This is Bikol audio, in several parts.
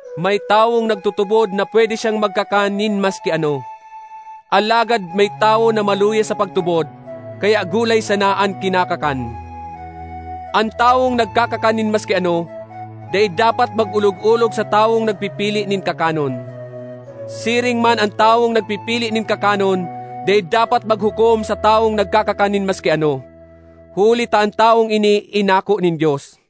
May tawong nagtutubod na pwede siyang magkakan nin maski ano, alagad may tawo na maluya sa pagtubod, kaya gulay sana an kinakakan. An tawong nagkakakan nin maski ano, dai dapat mag-olog-olog sa tawong nagpipili nin kakanon; siring man an tawong nagpipili nin kakanon dai dapat maghukom sa tawong nagkakakan nin maski ano, huli ta an tawong ini inako nin Dios.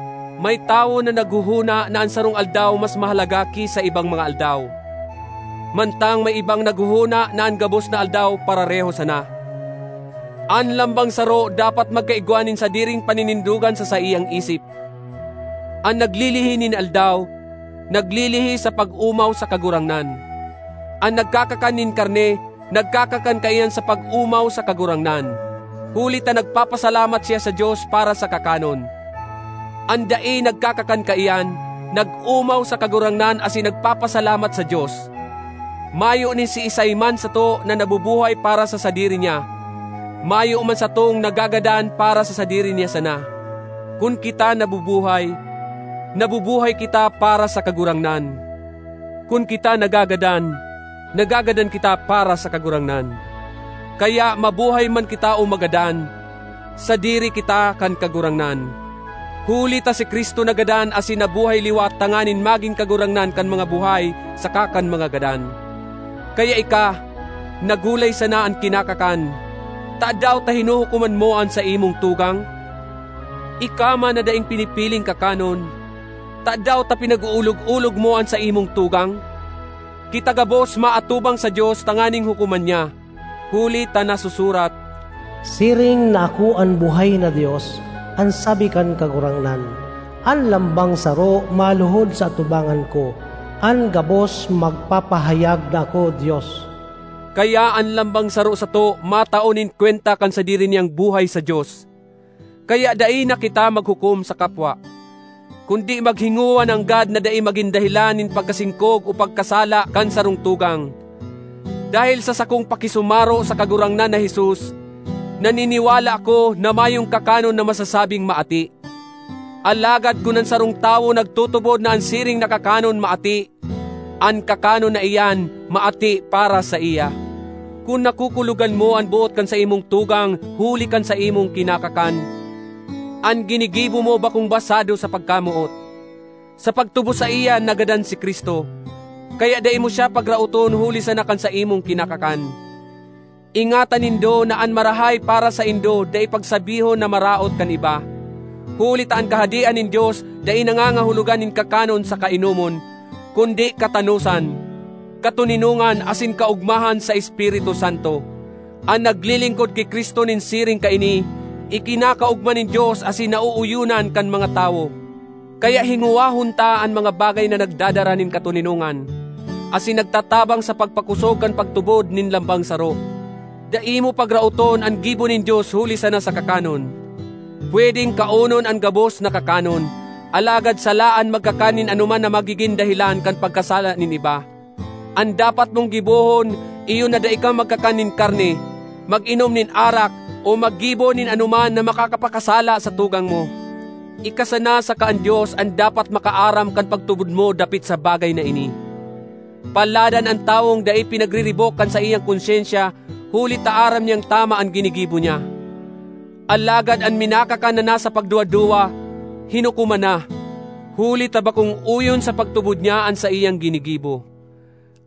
May tawo na naghohona na an sarong aldaw mas mahalaga ki sa ibang mga aldaw, mantang may ibang naghohona na an gabos na aldaw parareho sana. An lambang saro dapat magkaigwa nin sadiring paninindogan sa saiyang isip. An naglilihi nin aldaw, naglilihi sa pag-omaw sa Kagurangnan. An nagkakakan nin karne, nagkakakan kaiyan sa pag-omaw sa Kagurangnan, huli ta nagpapasalamat siya sa Dios para sa kakanon. An dai nagkakakan kaiyan, nag-omaw sa Kagurangnan asin nagpapasalamat sa Dios. Mayo nin siisay man sato na nabubuhay para sa sadiri niya; mayo man satong nagagadan para sa sadiri niya sana. Kun kita nabubuhay, nabubuhay kita para sa Kagurangnan; kun kita nagagadan, nagagadan kita para sa Kagurangnan. Kaya, mabuhay man kita o magadan, sadiri kita kan Kagurangnan. Huli ta si Cristo nagadan asin nabuhay liwat tanganing magin Kagurangnan kan mga buhay saka kan mga gadan. Kaya ika, na gulay sana an kinakakan, tadaw ta hinuhukoman mo an saimong tugang? Ika man na daing pinipiling kakanon, tadaw ta pinag-oolog-olog mo an saimong tugang? Kita gabos maatubang sa Dios tanganing hukoman niya. Huli ta nasusurat, “Siring na ako an buhay na Dios, an sabi kan Kagurangnan, an lambang saro maluhod sa atubangan ko, an gabos magpapahayag na ako Dios.” Kaya an lambang saro sato matao nin kwenta kan sadiri niyang buhay sa Dios. Kaya dai na kita maghukom sa kapwa. Kundi maghingowa nanggad na dai magin dahelan nin pagkasingkog o pagkasala kan sarong tugang. Dahel sa sakong pakisumaro sa Kagurangnan na Jesus, naniniwala ako na mayong kakanon na masasabing maati; alagad kun an sarong tawo nagtutubod na an siring na kakanon maati, an kakanon na iyan maati para saiya. Kun nakukulogan mo an boot kan saimong tugang huli kan saimong kinakakan, an ginigibo mo bakong basado sa pagkamoot. Sa pagtubos saiya nagadan si Cristo, kaya dai mo siya pagraoton huli sana kan saimong kinakakan. Ingatan nindo na an marahay para saindo dai pagsabihon na maraot kan iba. Huli ta an Kahadean nin Dios dai nangangahulogan nin kakanon saka inomon, kundi katanosan, katoninongan asin kaogmahan sa Espiritu Santo. An naglilingkod ki Cristo nin siring kaini, ikinakaogma nin Dios asin naooyonan kan mga tawo. Kaya hingowahon ta an mga bagay na nagdadara nin katoninongan, asin nagtatabang sa pagpakosog kan pagtubod nin lambang saro. Dai mo pagraoton an gibo nin Dios huli sana sa kakanon. Pwedeng kaonon an gabos na kakanon, alagad sala an magkakan nin anoman na magigin dahelan kan pagkasala nin iba. An dapat mong gibohon iyo na dai ka magkakan nin karne, mag-inom nin arak o maggibo nin anoman na makakapakasala sa tugang mo. Ika sana saka an Dios an dapat makaaram kan pagtubod mo dapit sa bagay na ini. Paladan an tawong dai pinagriribok kan saiyang konsyensya huli ta aram niyang tama an ginigibo niya. Alagad an minakakan na nasa pagduwa-duwa, hinukoman na, huli ta bakong oyon sa pagtubod niya an saiyang ginigibo.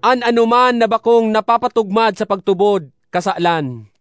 An anoman na bakong napapatugmad sa pagtubod, kasalan.